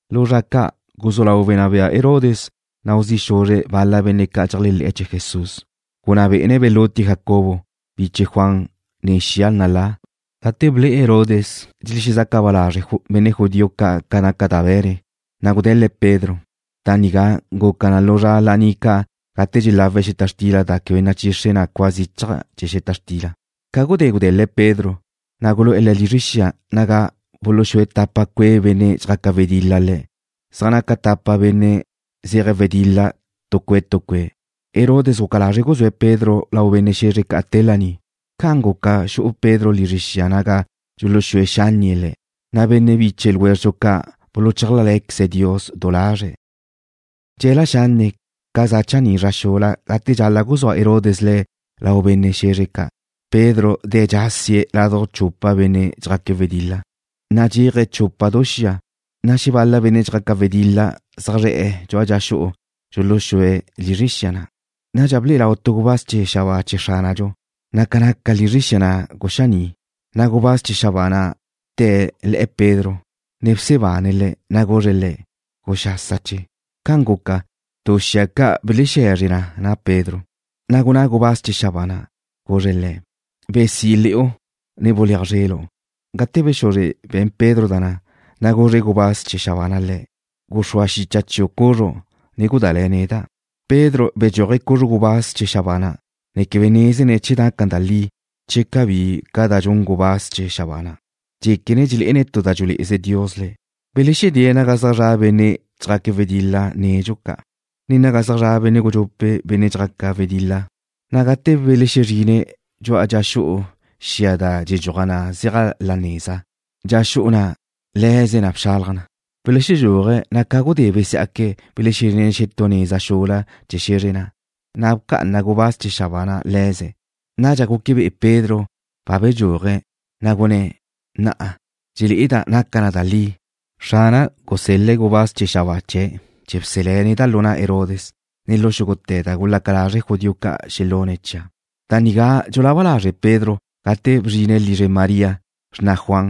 Lu zra ca' guzú lau wenná bea Herodes nau zi' xuzre̱' bal-la benne' ca' dxeléajle̱'e̱ chee̱ Jesús. Gunná bé'ene̱' belutie̱' Jacobo, biche Juan nen xia nalá. Gate ble'e Herodes dxelexezaca ba lazre' benne' judío ca' ca naca da be̱ne̱', na' gude̱l-le̱' Pedro. Da nigá guca na lu zra laní ca' gate dxelawe̱' xeta xtila da quebe nachixre na cua zichaj chee̱ xeta xtila. Ca gudé gude̱l-le̱' Pedro, na' gulu'e̱ le̱' lizre xia naga buluxúe tapa cue' benne' dxjaca wedil-la le̱', zaj naca tapa benne' zeje̱' wedil-la tu cue' tu cue'. Herodes guca lazre̱' guzúe̱' Pedro lau benne' xe̱zre ca' te laní. Ca'an guca xu'u Pedro lizre xia naga dxuluxúe xánnie̱' le̱', na' benne' biche ljwézredxu ca' buluchálajle̱queze̱' Dios du lazre̱'. Dxe̱la xanne' ca za chaní' zra xula gate dxal-la' guzúa Herodes le̱' lau benne' xe̱zre ca', Pedro de̱' dxásie̱' laduj chupa benne' dxjaque' wedil-la, nadxéaje̱' chupa du xia, na' xebal-la benne' dxjaca wedil-la zaj zre̱'e̱ dxu'a dxa xu'u dxuluxúe̱' lizre xia na'. Nadxa ble'e lau tu gubáz chee̱ xabáa chee̱ Xránadxu, na' ca naca lizre xia na' guxaní'. Na' gubáz chee̱ xabáa na' bte̱' le̱'e̱ Pedro, ne bsebane̱' le̱', na' guzre̱' le̱': ―Guxásache. Ca'an guca, du xia ca' belexexe̱zre na na' Pedro. Na' gunná gubáz chee̱ xabáa na', guzre̱' le̱': ―Besí le̱'u, ne buléaj zrelu'. Gate bexuzre be̱n Pedro da na', na' guzre gubáz chee̱ xabáa na' le̱': ―Guxrúa xicha chiu' cuxru', ne gudále̱ neda'. Pedro bedxúaje̱' cuzru gubáz chee̱ xabáa na', ne quebe nézene̱' che naca da li che cabí ca da dxun gubáz chee̱ xabáa na'. Dxéquene̱' dxelé'ene̱' tu da dxulé'e Dios le̱'. Belexedée̱' naga zaj zra' benne' dxjaque̱' wedil-la nedxu ca', ne naga zaj zra' benne' gudxupe' benne' dxjaque̱' wedil-la, na' gate belexezrine̱' dxu'a dxa xu'u xia da dxedxuaj zeaj la nézala, dxa xu'u na' le̱ze na bxalaj na. Belexedxúaje̱', na' ca gudé besiá'que̱' belezrine̱' xetú neza xula chee̱ xe̱zr na', na' bca'ana gubáz chee̱ xabáa na' le̱ze̱'. Nadxa guque be'e Pedro ba bedxúaje̱', na' guzá' lazre̱', gunné̱': Na'a dxelé'eda' naca na da li. Xrana' gusel-le̱' gubáz chee̱ xabáa chee̱' chee̱ bselé̱' neda' lu na' Herodes, ne lu xúgute̱ da gulaca lazre' judío ca' xelune̱' chia'. Da nigá dxulaba lazre' Pedro gate bzrine̱' lizre María, xrna Juan,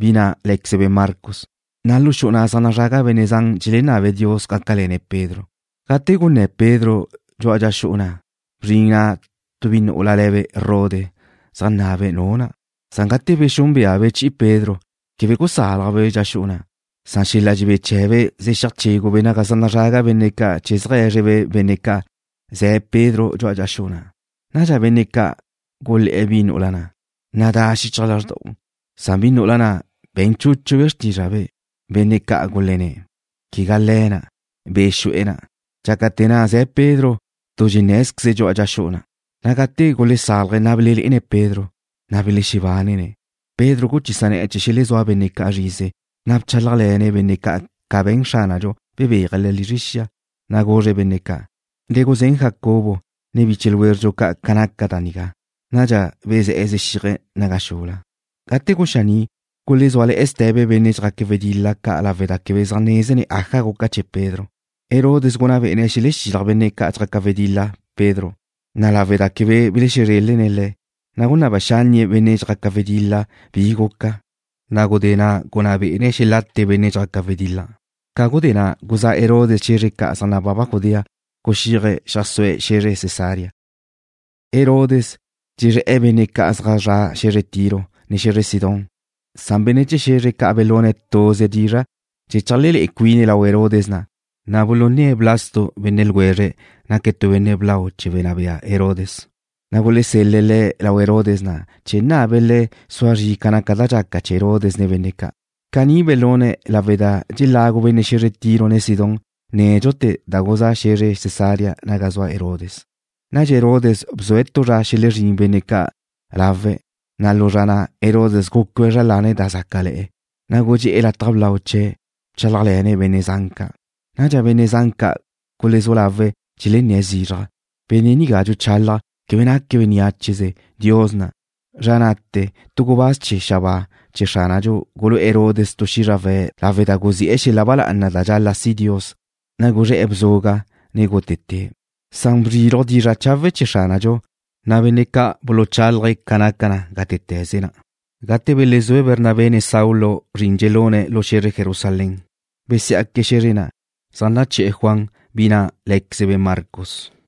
bi na' lé̱quezebe' Marcos, na' lu xu'u na' zaj nazraga benne' zan dxelenabe̱' Dios gácale̱ne̱' Pedro. Gate gunné̱ Pedro dxu'a dxa xu'u na', bzrin na' tu bi nu'ula le̱be' Rode zeajnabe' nu na'. Gate bexúnbeabe' chi'i Pedro, quebe gusálajbe' dxa xu'u. Xel-la' dxebé chee̱be' zexíaj chégube' naga zaj nazraga benne' ca' chee̱ zeajé̱zrebe' benne' ca' ze̱ Pedro dxu'a dxa xu'u. Nadxa benne' ca' gulé̱'e̱ bi nu'ula na': ―Nadá xichaj lázrda'u. Bi nu'ula na' be̱n chúchube' xrtízrabe'. Benne' ca' gulenné̱': ―Quebe le̱' na'. Be' guxu'e̱ na'. Dxácate̱ na' ze̱ Pedro tu dxenné̱zqueze̱' dxu'a dxa xu'u. Na' gate gulesálaje̱', ne belelé'ene̱' Pedro, na' belexebánene̱'. Pedro guchisa ne̱'e̱ chee̱ xelezúa benne' ca' zrize, na' bchálajle̱ne̱' benne' ca' ca be̱n Xránadxu bebéaje̱' le̱' lizre xia. Na' guzre̱' benne' ca': ―Le guzén Jacobo, ne biche ljwézredxu ca' ca naca da nigá. Nadxa bezé̱'e̱ zexíaje̱' naga xula. Gate guxaní', gulezúale̱'e̱ ste̱be benne' dxjaque̱' wedil-la ca' lawe' da quebe zaj nézene̱' aja guca chee̱ Pedro. Herodes gunná bé'ene̱' xelexilaj benne' dxjaca wedil-la Pedro, na' lawe' da quebe belexezrelne̱' le̱', na' gunáb xánnie̱' benne' dxjaque̱' wedil-la bi guca, na' gudé na' gunná bé'ene̱' xelate benne' ca' dxjaque̱' wedil-la. Ca gudé na' guzá' Herodes xe̱zre ca' zaj nababa Judea, guxíaje̱' xeajsúe̱' xe̱zre Cesarea. Herodes dxezré̱'e̱ benne' ca' zaj zre̱'e̱ xe̱zre Tiro, ne xe̱zre Sidón. Benne' chee̱ xe̱zre ca' belune̱' tuze dizra' chee̱ cheajlelé'e cuine̱' lau Herodes na'. Belune̱' Blasto benne' ljwezre̱'. Naque̱' tu benne' blau chee̱ wenná bea Herodes, na' gulesel-le̱' le̱' lau Herodes na' chee̱ nabe̱' le̱' sua zri ca naca da dxaca chee̱ Herodes nen benne' ca'. Caní belune̱' lawe' da nédxute̱ dxelagu benne' xe̱zre Tiro, ne Sidón da guzá' xe̱zre Cesarea naga zua Herodes. Nadxa Herodes bzue̱' tu zra xelezrín benne' ca' lawe̱'. Lu zra na' Herodes gucue̱' zra lane̱' da zácale̱'e̱, na' gudxé'e̱ lataj blau chee̱', ne bchálajle̱ne̱' benne' zan ca'. Nadxa benne' zan ca' gulezú lawe̱' dxelenné̱' zizraj: ―¡Benne' nigá dxuchálaje̱' quebe naque̱' beniácheze! ¡Dios na'! Zra na'te̱ tu gubáz chee̱ xabáa chee̱ Xránadxu gulu'e̱ Herodes tu xízrawe̱' lawe' da guzi'e̱ xel-la' ba lá'ana da dxal-la' si' Dios, na' guzré̱'e̱ bzuga', ne gútete̱'. Bzriluj dizra' chawe' chee̱ Xránadxu, na' benne' ca' buluchálaje̱' ca naca na gátete̱ze na'. Gate belezúe Bernabé, ne Saulo zrin dxelune̱' lu xe̱zre Jerusalén, besiá'que̱' xe̱zre na', zaj naché̱'e̱ Juan, bi na' lé̱quezebe' Marcos.